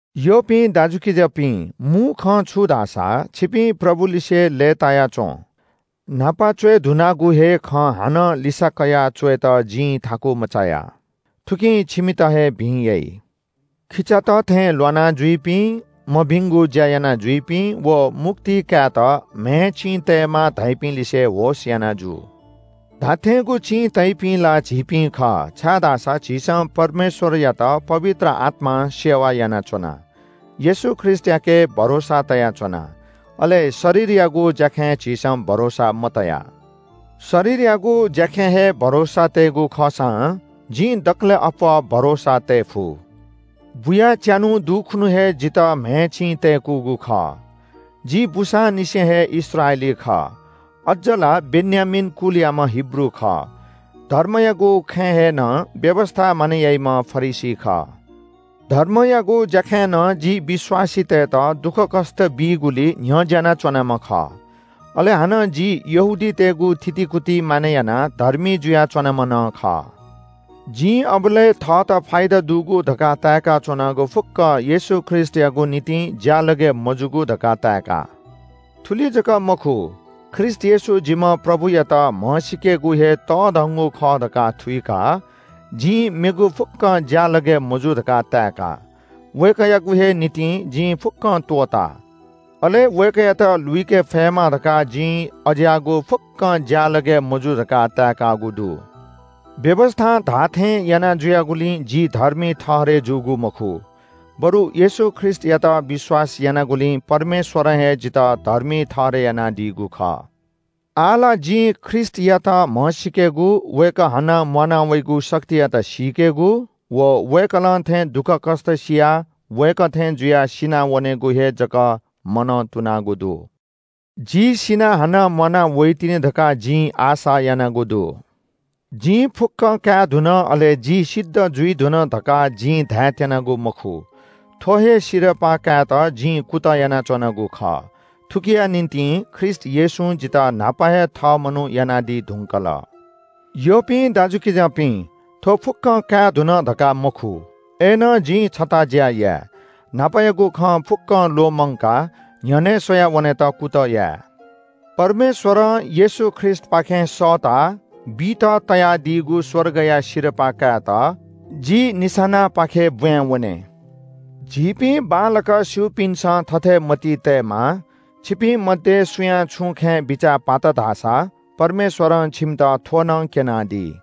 यःपिं दाजुकिजापिं, मू खँ छु धाःसा – छिपिं प्रभुलिसे लय्‌ताया च्‍वँ। न्‍हापा च्‍वये धुनागु हे खँ हानं लिसा कयाः च्‍वयेत जिं थाकु मचाया। थुकिं छिमित हे भिं याइ। खिचात थें ल्‍वाना जुइपिं, मभिंगु ज्‍या यानाजुइपिं व मुक्ति कायेत म्‍हय् चिं तयेमाः धाइपिं लिसे होश याना जु। धात्‍थेंगु चिं तइपिं ला झीपिं खः, छाय्‌धाःसा झीसं परमेश्‍वरयात पवित्र आत्‍मां सेवा यानाच्‍वना। येशू ख्रीष्‍टयाके भरोसा तयाच्‍वना, अले शरीरयागु ज्‍याखँय् झीसं भरोसा मतया। शरीरयागु ज्‍याखँय् हे भरोसा तयेगु खःसां जिं दकलय् अप्‍वः भरोसा तये फु। बुयाः च्‍यान्‍हु दुखुन्‍हु हे जितः म्‍हय् चिं तय्‌कूगु खः। जि बूसांनिसें हे इस्राएली खः, अज्‍ज ला बेन्‍यामीन कुलयाम्‍ह हिब्रू खः। धर्मयागु खँय् हे नं व्‍यवस्‍था मानय् याइम्‍ह फरिसी खः। धर्मयागु ज्‍याखँय् नं जि विश्‍वासीतय्‌त दुःखकष्‍ट बीगुलिइ न्‍ह्यज्‍याना च्‍वनाम्‍ह खः। अले हानं जि यहूदीतय्‌गु थितिकुति मानय् यानाः धर्मी जुया च्‍वनाम्‍ह नं खः। जिं अबलय् थःत फाइदा दुगु धकाः ताय्‌काच्‍वनागु फुक्‍कं येशू ख्रीष्‍टयागु निंतिं ज्‍यालगय् मजूगु धकाः ताय्‌का। थुलि जक मखु, ख्रीष्‍ट येशू जिम्‍ह प्रभुयात म्‍हसीकेगु हे तःधंगु खँ खः धकाः थुइकाः जिं मेगु फुक्‍कं ज्‍यालगय् मजू धकाः ताय्‌का। वय्‌कःयागु हे निंतिं जिं फुक्‍कं त्‍वःता, अले वय्‌कःयात लुइके फयेमा धकाः जिं अज्‍याःगु फुक्‍कं ज्‍यालगय् मजू धकाः ताय्‌कागु दु। व्‍यवस्‍थां धाःथें यानाजुयागुलिं जि धर्मी ठहरय् जूगु मखु बरु येशू ख्रीष्‍टयात विश्‍वास यानागुलिं परमेश्‍वरं हे जितः धर्मी ठहरय् यानादीगु खः। आः ला जिं ख्रीष्‍टयात म्‍हसीकेगु, वय्‌कः हानं म्‍वाना वइगु शक्तियात सीकेगु व वय्‌कलं थें दुःखकष्‍ट सियाः वय्‌कः थें जुयाः सिनावनेगु हे जक मनंतुनागु दु। जि सिनाः हानं म्‍वाना वइतिनि धकाः जिं आशा यानागु दु। जिं फुक्‍कं काये धुन अले जि सिद्ध जुइ धुन धकाः जिं धायेत्‍यनागु मखु। थ्‍व हे सिरपाः कायेत जिं कुतः यानाच्‍वनागु खः। थुकिया निंतिं ख्रीष्‍ट येशूं जितः न्‍हापा हे थः मनू यानादी धुंकल। यःपिं दाजुकिजापिं, थ्‍व फुक्‍कं काये धुन धकाः मखु। अय्‌नं जिं छता ज्‍या याये – न्‍हापायागु खँ फुक्‍कं ल्‍वःमंकाः न्‍ह्यःने स्‍वयाः वनेत कुतः याये। परमेश्‍वरं येशू ख्रीष्‍टपाखें सःताः बीत तयादीगु स्‍वर्गया सिरपाः कायेत जि निशानापाखे ब्‍बाँय् वने। झीपिं बांलाक स्‍यूपिन्‍सं थथे मतिइ तयेमाः। छिपिं मध्‍ये सुयां छुं खँय् बिचाः पात धाःसा परमेश्‍वरं छिमित थ्‍व नं क्‍यनादी।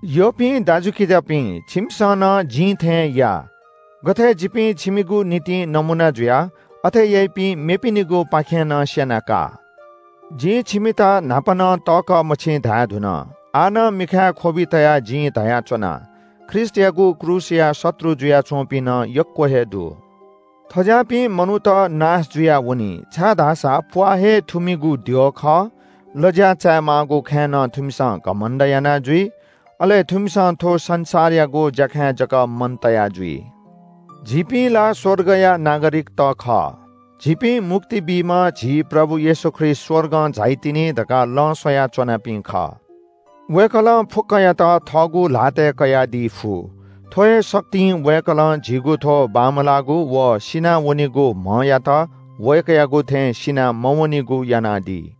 यःपिं दाजुकिजापिं, छिमिसं नं जिं थें या। गथे जिपिं छिमिगु निंतिं नमूना जुया, अथे याइपिं मेपिनिगुपाखें नं स्‍यना का। जिं छिमित न्‍हापा नं तःकः मछि धायेधुन। आः नं मिखाय् ख्‍वबि तयाः जिं धयाच्‍वना – ख्रीष्‍टयागु क्रूसया शत्रु जुयाच्‍वंपिं नं यक्‍व हे दु। थज्‍याःपिं मनूत नाश जुयावनी। छाय्‌धाःसा प्‍वाः हे थुमिगु द्यः खः, लज्‍या चायेमाःगु खँय् नं थुमिसं घमण्‍ड याना जुइ। अले थुमिसं थ्‍व संसारयागु ज्‍याखँय् जक मन तया जुइ। झीपिं ला स्‍वर्गया नागरिकत खः। झीपिं मुक्ति बीम्‍ह झी प्रभु येशू ख्रीष्‍ट स्‍वर्गं झाइतिनि धकाः लँ स्‍वया च्‍वनापिं खः। वय्‌कलं फुक्‍कयात थःगु ल्‍हातय् कयादी फु। थ्‍व हे शक्तिं वय्‌कलं झीगु थ्‍व बमलाःगु व सिनावनीगु म्‍हयात वय्‌कःयागु थें सिना मवनीगु यानादी।